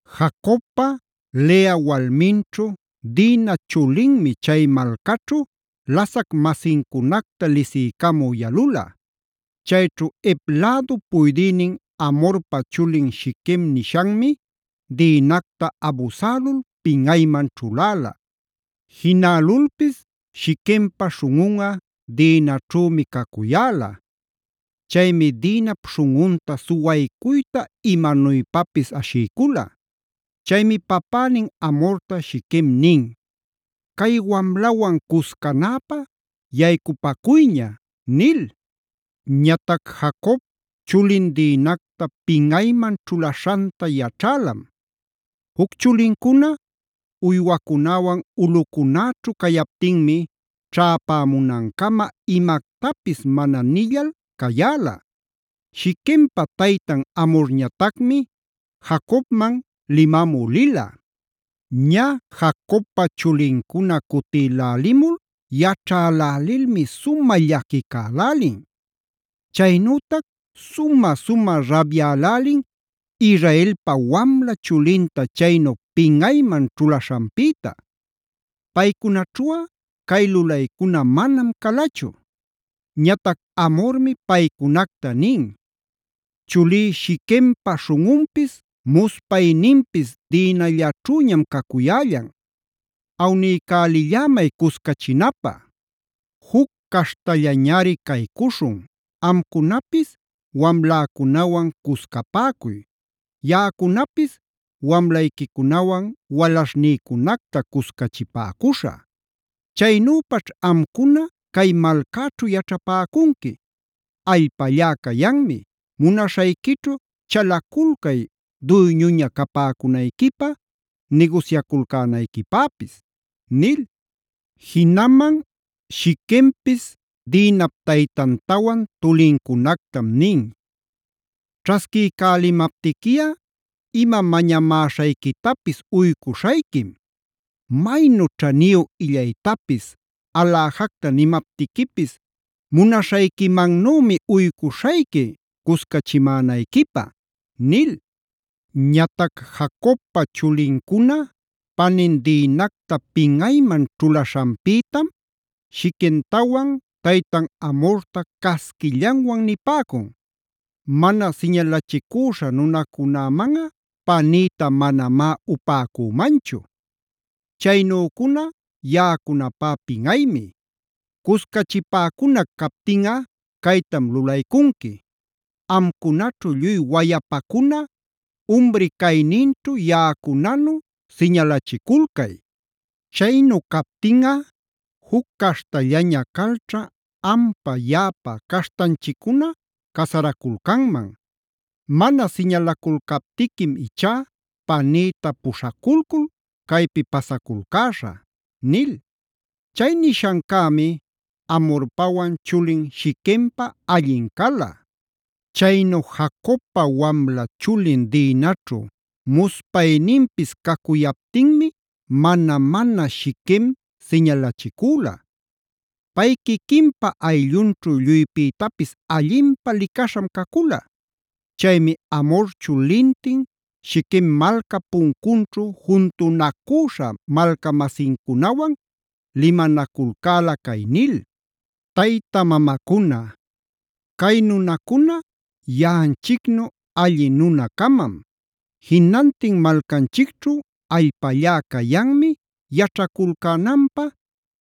Jacobpa Lea walminćhu Dina chulinmi chay malcaćhu lasac-masincunacta lisiycamü yalula. Chayćhu Hev lädup puydïnin Hamorpa chulin Shiquem nishanmi Dinacta abusälul pinꞌayman ćhuläla. Jinälulpis Shiquempa śhunꞌun Dinaćhümi cacuyäla. Chaymi Dinap śhunꞌunta suwaycuyta imanuypapis ashiycula. Chaymi papänin Hamorta Shiquem nin: “Cay wamlawan cuscanäpä yaycupacuyña” nil. Ñatac Jacob chulin Dinacta pinꞌayman ćhulaśhanta yaćhälam. Juc chulincuna uywacunäwan ulꞌucunäćhu cayaptinmi ćhäpämunancama imactapis mana nillal cayäla. Shiquempa taytan Hamorñatacmi Jacobman limamü lila. Ñä Jacobpa chulincuna cutïlälimul yaćhälälilmi sumä llaquicälälin. Chaynütac sumä-sumä rabyälälin Israelpa wamla chulinta chaynu pinꞌayman ćhulaśhanpïta. Paycunaćhuꞌa cay lulaycuna manam calachu. Ñatac Hamormi paycunacta nin: “Chulí Shiquempa śhunꞌunpis muspayninpis Dinallaćhüñam cacuyällan. Awniycälillämay cuscachinapä. Juc caśhtallañari caycuśhun, amcunapis wamläcunawan cuscapäcuy, yaꞌacunapis wamlayquicunawan walaśhnïcunacta cuscachipäcuśhä. Chaynüpaćh amcuna cay malcäćhu yaćhapäcunqui. Allpallá cayanmi, munaśhayquićhu chalaculcay duyñuña capäcunayquipä, nigusyaculcänayquipäpis” nil. Jinaman Shiquempis Dinap taytantawan tulincunactam nin: “Ćhasquiycälimaptiquiꞌa, ima mañamäśhayquitapis uycuśhayquim. Maynu ćhaniyu illaytapis, aläjacta nimaptiquipis munaśhayquimannümi uycuśhayqui cuscachimänayquipä” nil. Ñatac Jacobpa chulincuna panin Dinacta pinꞌayman ćhulaśhanpïtam Shiquemtawan taytan Hamorta casquillanwan nipäcun: “Mana siñalachicüśha nunacunämanꞌa panïta manamá upäcümanchu. Chaynücuna yaꞌacunapá pinꞌaymi. Cuscachipäcunac captinꞌa caytam lulaycunqui: Amcunaćhu lluy wayapacuna umri cayninćhu yaꞌacunanu siñalachiculcay. Chaynu captinꞌa juc caśhtallaña calćha ampa yaꞌapa caśhtanchiccuna casaraculcanman. Mana siñalaculcaptiquim ichá panïta puśhaculcul caypi pasaculcäśhä” nil. Chay nishancämi Hamorpawan chulin Shiquempa allin cala. Chaynu Jacobpa wamla chulin Dinaćhu muspayninpis cacuyaptinmi mana-mana Shiquem siñalachicüla. Pay quiquinpa ayllunćhu lluypïtapis allinpä licaśham cacula. Chaymi Hamor chulintin Shiquem malcap puncunćhu juntunacüśha malca-masincunawan limanaculcäla cay nil: “Tayta mamacuna, cay nunacuna yaꞌanchicnu alli nuna-camam. Jinantin malcanchicćhu allpallá cayanmi yaćhaculcänanpä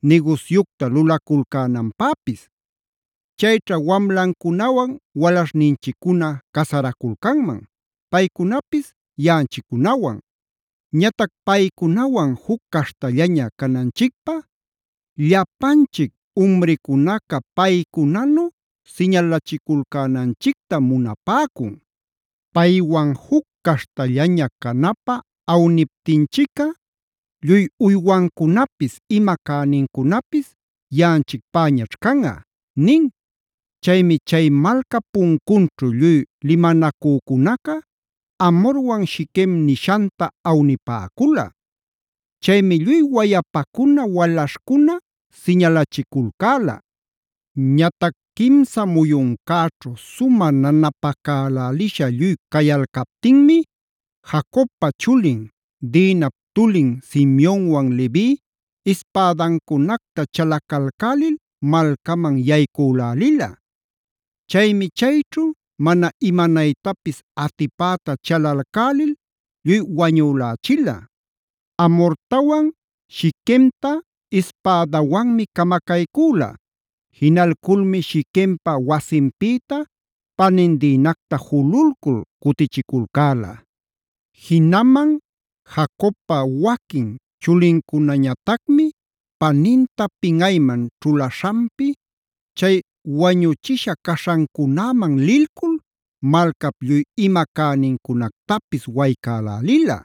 nigusyucta lulaculcänanpäpis. Chayćha wamlancunawan walaśhninchiccuna casaraculcanman, paycunapis yaꞌanchiccunawan. Ñatac paycunawan juc caśhtallaña cananchicpä llapanchic umricunaca paycunanu siñalachiculcänanchictam munapäcun. Paywan juc caśhtallaña canapä awniptinchicꞌa lluy uywancunapis ima cänincunapis yaꞌanchicpäñach canꞌa” nin. Chaymi chay malcap puncunćhu lluy limanacücunaca Hamorwan Shiquem nishanta awnipäcula. Chaymi lluy wayapacuna, walaśhcuna siñalachiculcäla. Ñatac quimsa muyuncäćhu sumä nanapacälälisha lluy cayalcaptinmi Jacobpa chulin, Dinap tulin Simeonwan Levi ispädancunacta chalacalcälil malcaman yaycülälila. Chaymi chayćhu mana imanaytapis atipäta chalalcälil lluy wañülächila. Hamortawan Shiquemta ispädawanmi camacaycüla. Jinalculmi Shiquempa wasinpïta panin Dinacta jululcul cutichiculcäla. Jinaman Jacobpa waquin chulincunañatacmi paninta pinꞌayman ćhulaśhanpi chay wañuchisha caśhancunäman lilcul malcap lluy ima cänincunactapis waycälälila.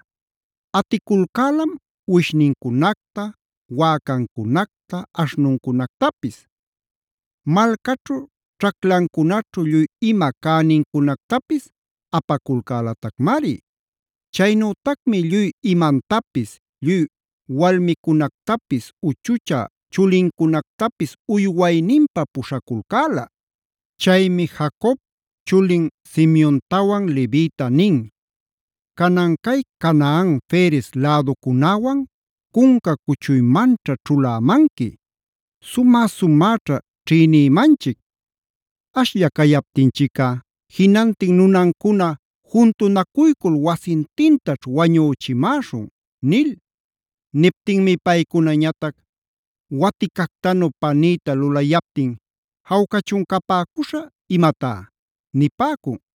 Aticulcälam uwishnincunacta, wäcancunacta, aśhnuncunactapis. Malcaćhu ćhaclancunaćhu lluy ima cänincunactapis apaculcälatacmari. Chaynütacmi lluy imantapis lluy walmicunactapis, uchuchä chulincunactapis uywayninpä puśhaculcäla. Chaymi Jacob chulin Simeontawan Levita nin: “Canan cay Canaan Ferez läducunäwan cunca cuchuymanćha ćhulämanqui. Sumä-sumäćha ćhïnïmanchic. Ashlla cayaptinchicꞌa jinantin nunancuna juntunacuycul wasintintaćh wañüchimäśhun” nil. Niptinmi paycunañatac: “Waticactanu panïta lulayaptin ¿jawcachun capäcuśha imatá?” nipäcun.